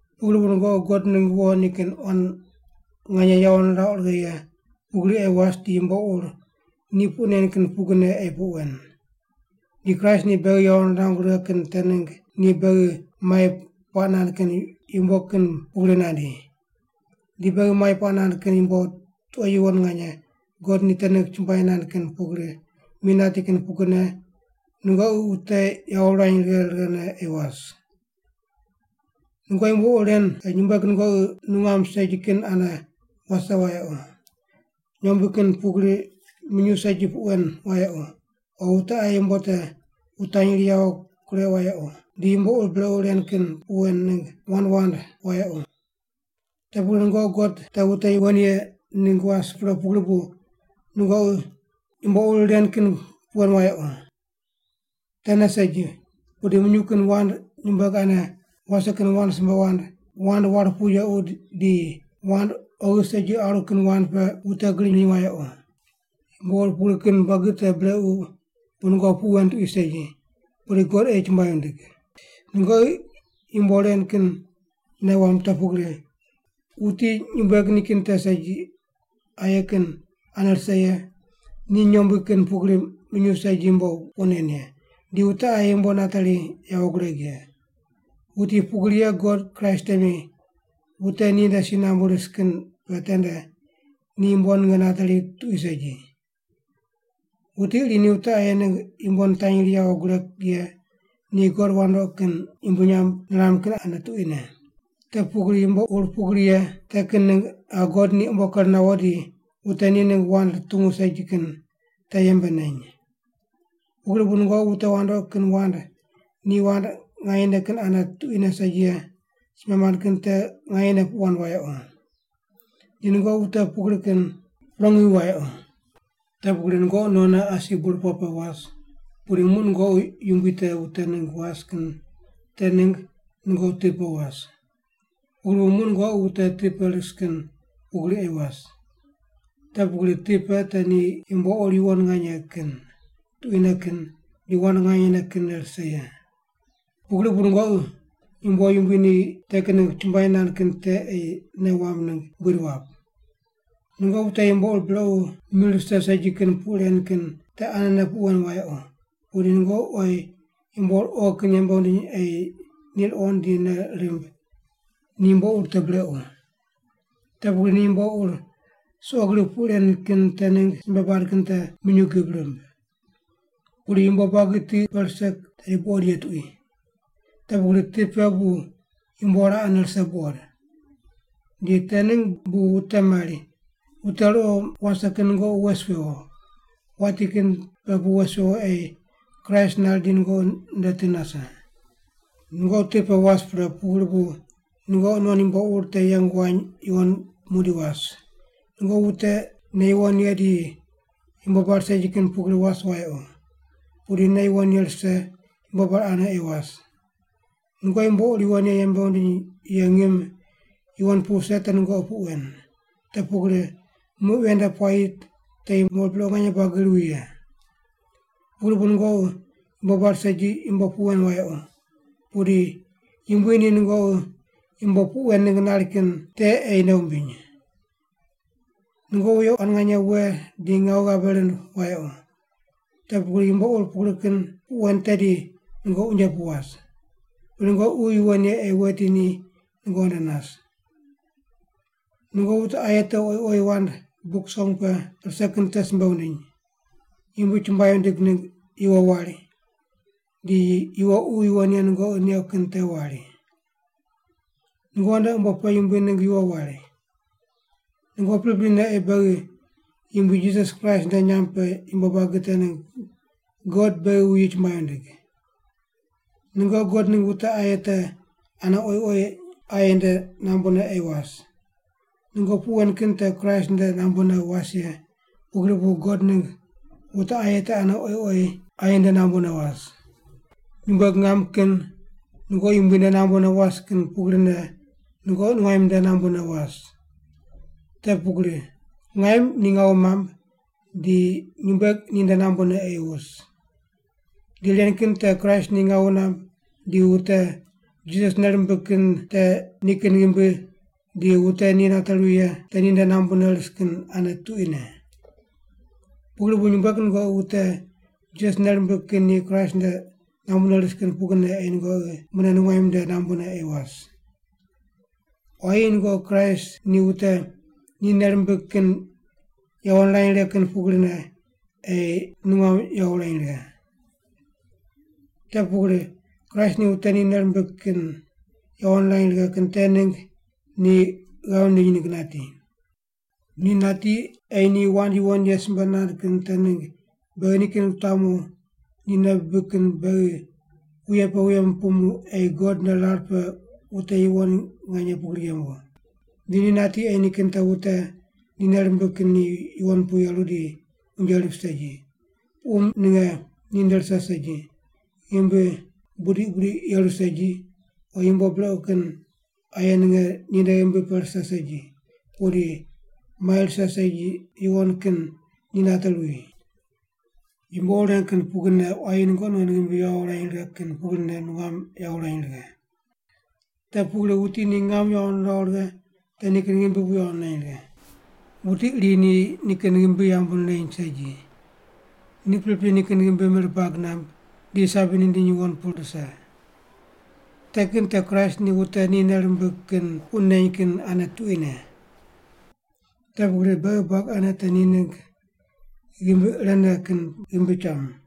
Pugri bu nungoqi God ningg wo nikin quan nganye yawo nirauq righe ye pugri ei was di yumbo ur ni puq nen kin pugrine ei puq wen. Di Kraist ni beghi yawo nirangu righe kin te ningg ni beghi mai puaq nand kin yumbo kin pugri nandi. Di beghi mai puaq nand kin yumbo tuqo yuwon nganye God ni te ningg chumbuai nand kin pugri mi nati kin pugrine nungoqi wute yawo wurany righe righene ei was. Nungoqi yumbo ur ren nyumbueg nungoqi nungam segi kin ane wase wayequ, nyombui kin pugri minyuw segi puq wen wayequ, o wute aye yumbo te wutanyri yawo kureuq wayequ, di yumbo ur brequ ren kin puq wen ningg wand wand wayequ. Te pugri nungoqi God te wute yuwon ye ningg was pre pugri bu nungoqi yumbo ur ren kin puq wen wayequ. Tene segi, pudi minyuw kin wand nyumbueg ane wase kin wand simbe wand, wand war pu yequ di wand oghi segi aru kin wand pe wute griny wand wundiny wayequ. Yumbo ur pugri kin buagi te brequ bu nungoqi puq wen tuqui segi, pudi God ei chumbuai wundig. Nungoqi yumbo ren kin nei wamb te pugri: Wuti nyumbueg nikin te segi aye kin ane rise ye, ni nyombui kin pugri minyuw segi yumbo puq nen ye, di wute aye yumbo nateri yawo gureg ye, wuti pugri ye God Kraist temi wute ninde si nambu ris kin pe tende ni yumbo ninge nateri tuqui segi. Wuti iri ni wute aye ningg yumbo nitanyri yawo gureg ye ni god wandoqi kin yumbui nyamb niram kin ane tuquine. Te pugri yumbo ur pugri ye te kin ningg qa God ni umbo ker nawo di wute ni ningg wand rutungu segi kin te yembe neny. Pugri bu nungoqi wute wandoqi kin wand ni wand nganyene kin ane tuquine segi ye simbe mand kin te nganyene puq wand wayequ. Di nungoqi wute pugri kin prongi wi wayequ. Te pugri nungoqi nonne asi burpoq pe was, pudi muq nungoqi Yumbui te wute ningg was kin te ningg nungoqi ti pe was. Pugri bu muq nungoqi wute ti pe ris kin pugri ei was. (Te pugri ti pe te ni yumbo ur yuwon nganye kin, tuquine kin di wand nganyene kinne rise ye.) Pugri bu nungoqi yumbo Yumbui ni te kin ningg chumbuai nand kin te ei nei wamb ningg buid wap. Nungoqi wute yumbo ur brequ mir rise segi kin puq ren kin te anene puq wen wayequ, pudi nungoqi oyi yumbo ur oghi kin yembe wundiny ei ni ruqond di nei rimb ni yumbo ur te brequ. Te pugri ni yumbo ur suqo gri puq ren kin te ningg simbe bad kin te minyuw gib rimb. Pudi yumbo buagi ti pe rise tedi buqod ye tuqui. Te pugri ti pe bu yumbo raqene rise buqod. Di te ningg bu wute mari, “Wute ruqo wase kin nungoqi wes wewo, wati kin pe pu wes wewo ei Kraist nari di nungoqi nde ti nase.” Nungoqi ti pe was pre pugri bu nungoqi non yumbo ur te yeng wany yuwon muqdi was, nungoqi wute nei yuwon ye di yumbo bar segi kin pugri was wayequ, pudi nei yuwon ye rise yumbo bar ane ei was. Nungoqi yumbo ur yuwon ye yembe wundiny ye ngim yuwon pu wuse te nungoqi puq wen, te pugri muq ven nde puayi te yumbo ur brequ nganye buagi ruwi ye. Pugri bu nungoqi yumbo bar segi yumbo puq wen wayequ, pudi Yumbui ni nungoqi yumbo puq wen ningg nari kin te ei nei wumbiny. Nungoqi wuye quan nganye we di ngawu ghabe rind wayequ, te pugri yumbo ur pugri kin puq wen tedi nungoqi unje pu was. Pudi nungoqi Ququ Yuwon Ye ei weti ni nungoqi nde nas. Nungoqi wute aye te oyi oyi wand Buk Song pe rise kin te simbe wundiny, Yumbui chumbuai wundig ningg yuwo wari, di yuwo Ququ Yuwon Ye nungoqi neuq kin te wari. Nungoqi nde umbo pe Yumbui ningg yuwo wari. Nungoqi priprine ei beghi Yumbui Jisas Kraist nde nyamb pe yumbo buagi te ningg God beghi wuyi chumbuai wundig. Nungoqi God ningg wute aye te ane oyi oyi aye nde nambune ei was. Nungoqi puq wen kin te Kraist nde nambune was ye, pugri bu God ningg wute aye te ane oyi oyi aye nde nambune was. Nyumbueg ngam kin nungoqi Yumbui nde nambune was kin pugrine nungoqi nungaim nde nambune was. Te pugri ngaim ni ngawu namb di nyumbueg ninde nambune ei wus. Di ren kin te Kraist ni ngawu namb di wute Jisas nei rimbig kin te nikin ghimbi di wute ni nate ruwi ye te ninde nambu ris kin ane tuquine. Pugri bu nyumbueg nungoqi wute Jisas nei rimbig kin ni Kraist nde nambune ris kin pugrine ei nungoqi mune nungaim nde nambune ei was. Quayi nungoqi Kraist ni wute ni nei rimbig kin yawo nirany righe kin pugrine ei nungam yawo wurany righe. Te pugri Kraist ni wute ni nei rimbig kin yawo nirany righe kin te ningg ni ghav nindiny ningg nati. Ni nati ei ni wand yuwon ye simbe nand kin te ningg beghi nikin wutamu ni nei bibig kin beghi wuye pe wuye nupumu ei God nde rar pe wute yuwon nganye pugri yembu. Di ni nati ei nikin te wute ni nei rimbig kin ni yuwon pu yeru di unje rip segi, puqum ninge ninde rise segi, ghimbi budiq budiq yeru segi o yumbo brequ kin aye ninge ninde ghimbi pe rise segi, pudi mai rise segi yuwon kin ni nate ruwi. Yumbo ur ren kin pugrine quayi nungoqi non ghimbi yawo wurany righe kin pugrine nungam yawo wurany righe. Te pugri wuti ni ngam yawo niraw righe te nikin ghimbi bu yawo nirany righe. Wuti iri ni nikin ghimbi yambu nireny segi. Ni pripri nikin ghimbi mir bag namb di sabi nindiny yuwon pu rise. Te kin te Kraist ni wute ni nei rimbig kin puq neny kin ane tuquine. Te pugri beghi buagi ane te ni ningg ghimbi irene kin ghimbi cham.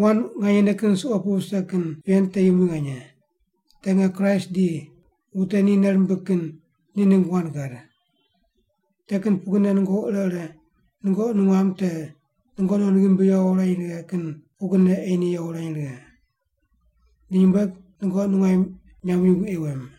Wand nganyene kin suqo pu vise kin ven te yumbui nganye. Te nge Kraist di wute ni nei rimbig kin ni ningg wand gad. Te kin pugrine nungoqi ire ire nungoqi nungam te nungoqi non ghimbi yawo wurany righe kin pugrine ei ni yawo wurany righe. Di nyumbueg nungoqi nungaim nyamb yumbui ei wem.